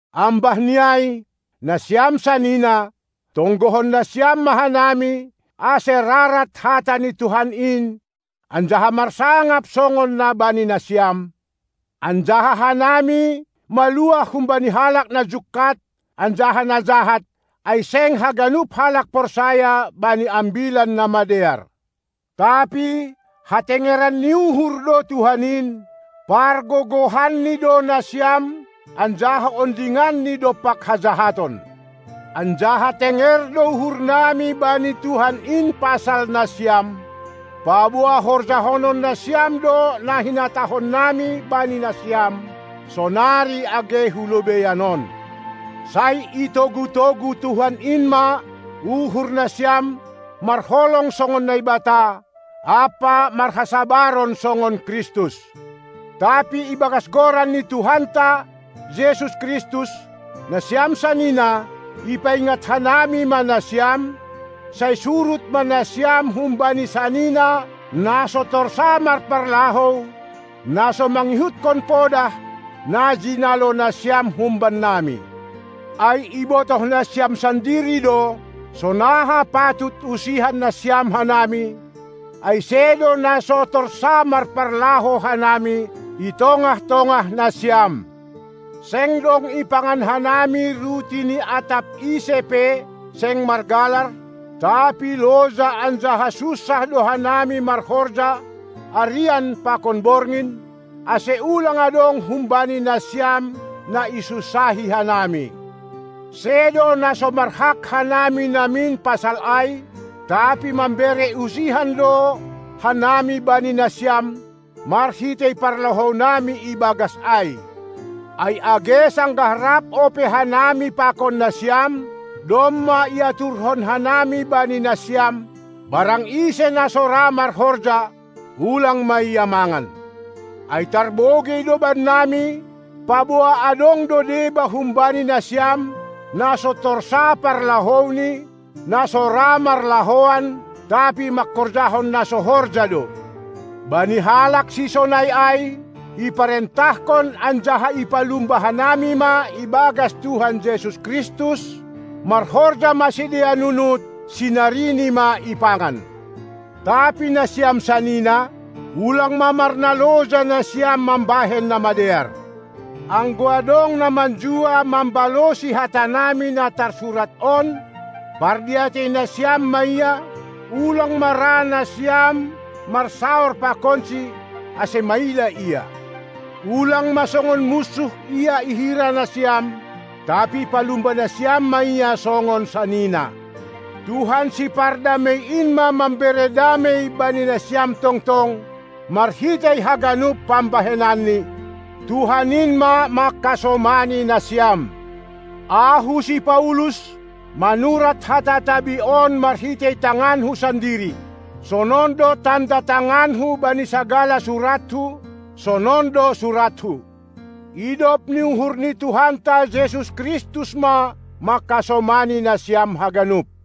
Ambahni ai, nasiam sanina, tonggohon nasiam ma hanami, ase rarat hata ni Tuhan in anjaha marsangap songon na bani nasiam, anjaha hanami maluah humbani halak na jungkat anjaha na jahat, ai seng haganup halak porsaya bani ambilan na madear. Tapi hatengeran ni uhur do Tuhan in; pargogohanNi do nasiam anjaha ondinganNi dompak hajahaton. Anjaha tenger do uhurnami bani Tuhan in pasal nasiam, paboa horjahonon nasiam do na hinatahonnami bani nasiam, sonari age hu lobeian on. Sai itogu-togu Tuhan in ma uhur nasiam marholong songon Naibata, ampa marhasabaron songon Kristus. Tapi ibagas goran ni Tuhanta Jesus Kristus, nasiam sanina, ipaingat hanami ma nasiam, sai surut ma nasiam humbani sanina na so torsa marparlahou, na so mangihutkon podah, na jinalo nasiam humbannami. Ai ibotoh nasiam sandiri do, sonaha patut usihan nasiam hanami, ai sedo na so torsa marparlahou hanami i tongah-tongah nasiam; seng dong ipangan hanami ruti ni atap ise pe seng margalar, tapi loja anjaha sunsah do hanami marhorja arian pakon borngin, ase ulang adong humbani nasiam na isunsahi hanami. Sedo na so marhak hanami namin pasal ai, tapi mambere usihan do hanami bani nasiam marhitei parlahounami ibagas ai. Ai age sanggah rap ope hanami pakon nasiam, domma iaturhon hanami bani nasiam: Barang ise, na so ra marhorja, ulang ma ia mangan. Ai tarbogei do bannami, paboa adong do deba humbani nasiam, na so torsa parlahouni, na so ra marlahoan, tapi manghorjahon na so horja do. Bani halak sisonai ai iparentahkon anjaha ipalumba hanami ma ibagas Tuhan Jesus Kristus: Marhorja ma sidea nunut, sinarini ma ipangan! Tapi nasiam sanina, ulang ma marnaloja nasiam mambahen na madear! Anggo adong na manjua mambalosi hatanami na tarsurat on, pardiatei nasiam ma ia, ulang ma ra nasiam marsaor pakonsi, ase maila ia. Ulang songon munsuh ia ihira nasiam, tapi palumba nasiam ma ia songon sanina. Tuhan Sipardamei in ma mambere damei bani nasiam tongtong marhitei haganup pambahenanni! Tuhan in ma manghasomani nasiam! Ahu, si Paulus, manurat hata tabi on marhitei tanganku sandiri. Sonon do tanda tanganku bani sagala surathu, sonon do surathu. Idop ni uhur ni Tuhanta Jesus Kristus ma manghasomani nasiam haganup!